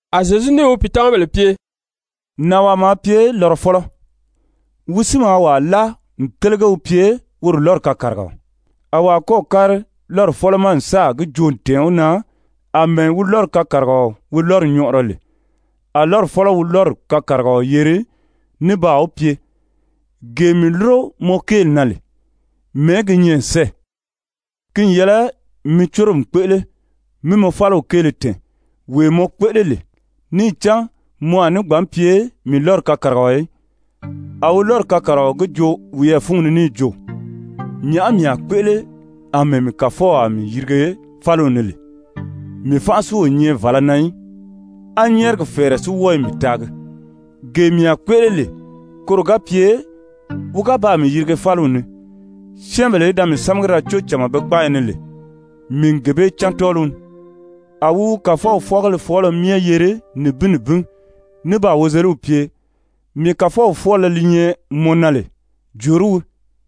A Zyezu níì wi pìitamabèle pye: «Nànwaa maa pye lɔrɔfɔlɔ, wi si maa wàa láa n télege wi pye woro lɔ́ri kakarigaɔ, a wàa kɔ́ɔ̀ kári lɔ́ri fɔ́lɔ ma n sáà gi joo n tɛ̀ɛn wi na àmɛɛ wi lɔ́ri kakarigaɔ wi lɔ́ri nyɔʔɔrɔ lè. A lɔ́ri fɔ́lɔ wi lɔ́ri kakarigaɔ yeri ní baa wi pye: ‹Gee mii lúro mɔ kéeli na lè, mɛ̀ɛ́ gi nyɛ n sɛ́ɛ? Ki n yɛlɛ mi córomi kpéʔele mí mɔ fáliw kéele tɛ̀ɛn, wee mɔ kpéʔele lè, níì cán mɔ a ní gbǎn pye mii lɔ́ri kakarigaɔ í.› A wi lɔ́ri kakarigaɔ gi joo wiyɛɛ fúngi ni níì jo: ‹Nyàʔá mii a kpéʔele àmɛɛ mii kàfɔw a mii yirige fáliw ni lè? Mii fánʔa si o nyɛ vàlá na í, á nyɛ́ɛrigi fɛ̀ɛrɛ si wɔ́ɔ i mii taagi. Gee mii a kpéʔele lè koro ga pye wi ga baa mii yirige fáliw ni, syɛ́ɛnbèle í da mii sámagi da có cama be kpáayi ni lè, mii n gee bee cán tɔ́ɔliw ni.› A wi wi kàfɔw fwɔ́ɔgéle fɔɔlɔ myɛ yeri nibin nibin ní baa wozeliw pye: ‹Mii kàfɔw fwɔ́ɔlɔ li nyɛ mɔ na lè, jòorí wii?›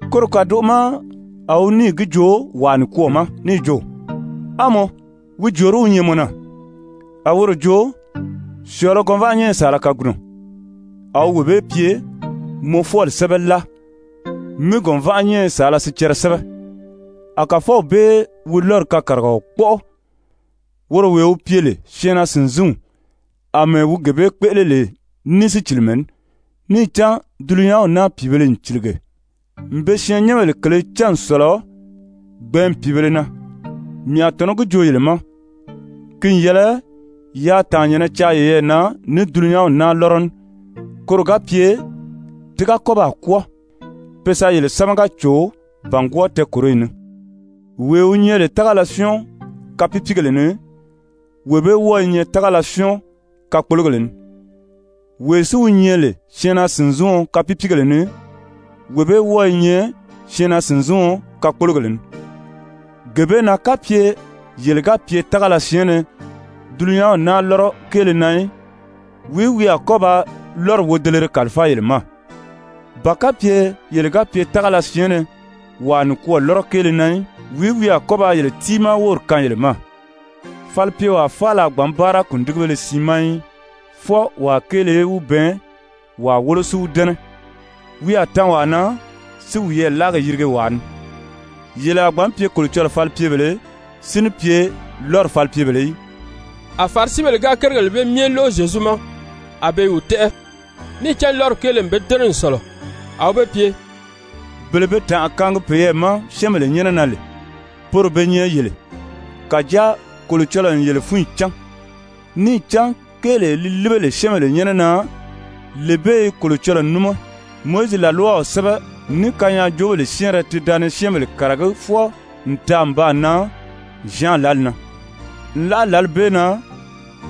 Koro kàdoʔo ma a wi níì gi joo wàa nikwɔɔ ma níì jo: ‹A mɔ, wi jòorí wi nyɛ mɔ na?› A woro jo: ‹Syɔ̀ɔ̄lɔ gɔnvaʔanyɛnyɛ saala kagunɔ.› A wi wee bee pye: ‹Mɔ fwɔ́ɔli sɛ́bɛ láa mi gɔ̀nvaʔanyɛnyɛ saala sicɛrɛ sɛ́bɛ.› A kàfɔw bee wi lɔ́ri kakarigaɔ kpɔ́ʔɔ, woro wee wi pye lè syɛɛnnaa-sìnzinw, àmɛɛ wi gee bee kpéʔele lè ní sícilimɛ ní. Níì cán dulunyanw naa pìibēle n cìlige n be syɛɛnnyɛnbèle kèlē cán n sɔ̀lɔ gbɛ̀ɛ́nmi pìibēle na. Mii a tɔ̀nɔ́ gi joo yele ma, ki n yɛlɛ yaa tàannyɛ̀nnɛ caa yeyɛɛ na ní dulunyanw naa lɔ́rɔ ní, koro ga pye ti ga kɔ́ baa kwɔ́ɔ, pe sa yele sámaga cò bàngwɔɔ tɛɛkòroyi ni, wee wi nyɛ lè tágala syɔ́ɔn kapiipiigèle ni, wee bee wɔ́ɔ i nyɛ tágala syɔ́ɔn kakpologèle ni. Wee si wi nyɛ lè syɛɛnnaa-sìnziɔn kapiipiigèle ni, wee bee wɔ́ɔ i nyɛ syɛɛnnaa-sìnziɔn kakpologèle ni. Gee bee na kapye yele ga pye tágala syɛɛnnɛ dulunyanw naa lɔ́rɔ kéele na í, wìí wi a kɔ́ ba lɔ́ri wodelere kàlifáa yele ma? Ba kapye yele ga pye tágala syɛɛnnɛ wàa nikwɔɔ lɔ́rɔ kéele na í, wìí wi a kɔ́ ba yele tiimaa wóri kaan yele ma? Falipyewaa faala a gbǎn báara kùndigibéle siin ma í. Fwɔɔ wàa kéele í wi bɛɛn, wàa wólo si wi dɛ́nɛ, wi a tan wàa na, si wiyɛɛ láagi yirige wàa ni. Yele a gbǎn pye Kolocɔlɔɔ falipyebèlē, si ní pye lɔ́ri falipyebèlē í.» A Farisibèle ga kérigèle bee myɛ lóʔo Zyezu ma, a be i wi tɛ́ʔɛ, níì cán lɔ́ri kéele n be dɛ́nɛ n sɔ̀lɔ. A wi be pye: «Bele be tànʔa kaangi peyɛɛ ma syɛ́ɛnbèle nyɛ́nɛ na lè, poro be nyɛ yele. Kàjáa Kolocɔlɔɔ n yele fúnyi cán. Níì cán kéelee li líbe lè syɛ́ɛnbèle nyɛ́nɛ na, lee bee i Kolocɔlɔɔ níma. Mowizi làlwaw sɛ́bɛ, ní kanyaajoobèle syɛ́ɛnrɛ ti da ni syɛ́ɛnbèle kàragí fwɔɔ n taa n baa nan Zyan lǎli na. Nlaʔa lǎli bee na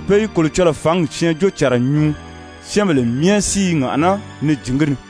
pe i Kolocɔlɔɔ fǎngi syɛɛnjóocànra nyuu, syɛ́ɛnbèle myɛ si i ŋàʔaná ni jǐn gi ni.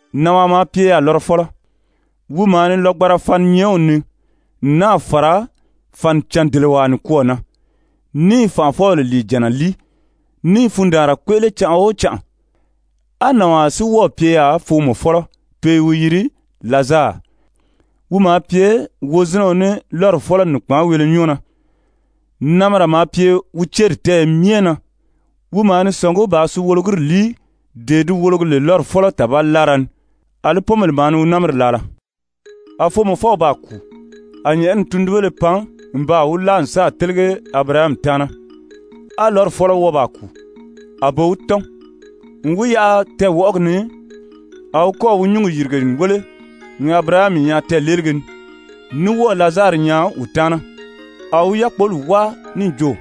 «Nànwaa maa pye yaà lɔrɔfɔlɔ, wi maa ni lɔgbanra faninyɛɛnw nii n náà fàra fànicàn-dèlewaa nikwɔɔ na, ní i fànʔafɔbèle lìijànna líi, ní i fundaanra kpéʔele canʔa o canʔa. A nànwaa si wɔ́ɔ̀ pye yaà foomɔfɔlɔ pe i wi yiri Lazari, wi maa pye wozinɛɔ ní lɔ́ri fɔ́lɔ nìkpaanweele nyɔ́ɔ na, namira maa pye wi céri tɛ́ɛyɛ myɛ na. Wi maa ni sɔ̀ngí bàā suwologiri líi, dee di wologi lè lɔ́ri fɔ́lɔ tàbali láara ni. Alí pɔ́nbèle maa ni wi námiri laala. A foomɔfɔw baa kùu, a nyɛ̀ʔɛni tundunbéle pan n baa wi láa n sáà télege Abirahami taana. A lɔ́ri fɔ́lɔ wɔ́ɔ baa kùu, a be wi tɔ́n. N wi yaʔa tɛɛwɔʔɔgi ni a wi kɔ́ɔ̀ wi nyǔngi yìrige n wéle n Abirahami nyaa tɛɛ̀leelige ni, ní wɔ́ɔ̀ Lazari nyaa wi taana. A wi yákpoli wáa níì jo: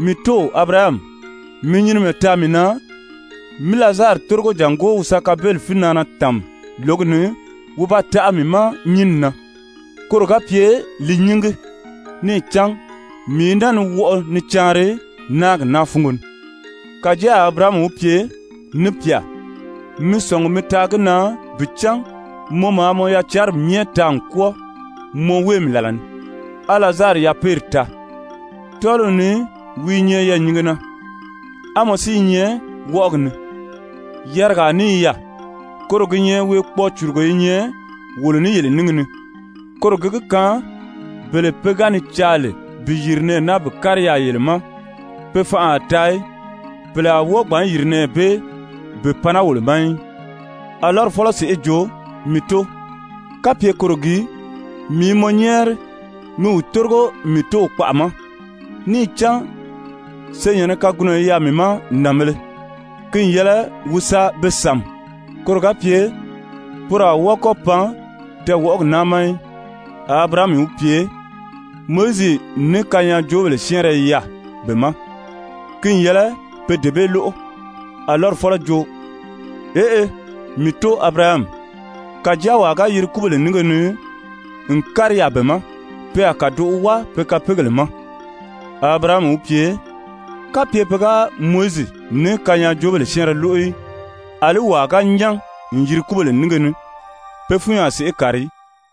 ‹Mii tóo Abirahami, mi nyinimɛ taa mii na, mí Lazari tórigo jàngó wi sa kabeli fínaana tàmi lǒgi ni wi ba taʔa mii ma nyínni na koro ga pye li nyíngi. Níì cán mii i naa ni wɔʔɔ ni caanri náagi naa fúngo ni.› Kàjáa a Abirahami wi pye: ‹Ni pyà, mi sɔ̀ngi mi taa gi na bi cán mɔ maa mɔ yacanri myɛ taa n kwɔ́ɔ mɔ wéemi làla ni, á Lazari yapeeri taa, tɔ́ɔliw ni wi i nyɛ yɛɛ̀nyinge na, á mɔ si i nyɛ wɔʔɔgi ni. Yarigaa ní i yaà, koro gi nyɛ weekpɔɔ-cùrugo i nyɛ wolo ní yele níngi ni, koro gi gi kaan bele pe ga ni caa lè bi yìri nɛɛ naa bi kári yaà yele ma, pe fanʔa a taa í. Pèle a wɔ́ɔ gbǎn yìri nɛɛ bee bi pan naa wolo ma í.› A lɔ́ri fɔ́lɔ sèʔê jo: ‹Mii tóo, kapye koro gii, mii i mɔ nyɛ́ɛri mi wi tórigo mii tóow kpaʔa ma. Níì cán senyɛ̀nnɛ kagunɔ i yaà mii ma nànbēle. Ki n yɛlɛ wi sa be sàmi koro ga pye poro a wɔ́ɔ kɔ́ pan tɛɛwɔʔɔgi naa ma í.› A Abirahami wi pye: ‹Mowizi ní kanyaajoobèle syɛ́ɛnrɛ i yaà be ma, ki n yɛlɛ pe dee bee lóʔo.› A lɔ́ri fɔ́lɔ jo: ‹Eʔe, mii tóo Abirahami, kàjáa wàa ga yiri kúbèle nínge ni n kári yaà be ma, pe a kàdoʔo wáa pe kapeegèle ma.› A Abirahami wi pye: ‹Kapye pe ga Mowizi ní kanyaajoobèle syɛ́ɛnrɛ lóʔo í, àlí wàa ga nyán n yiri kúbèle nínge ni, pe fúnyi a sèʔé kàri í.›»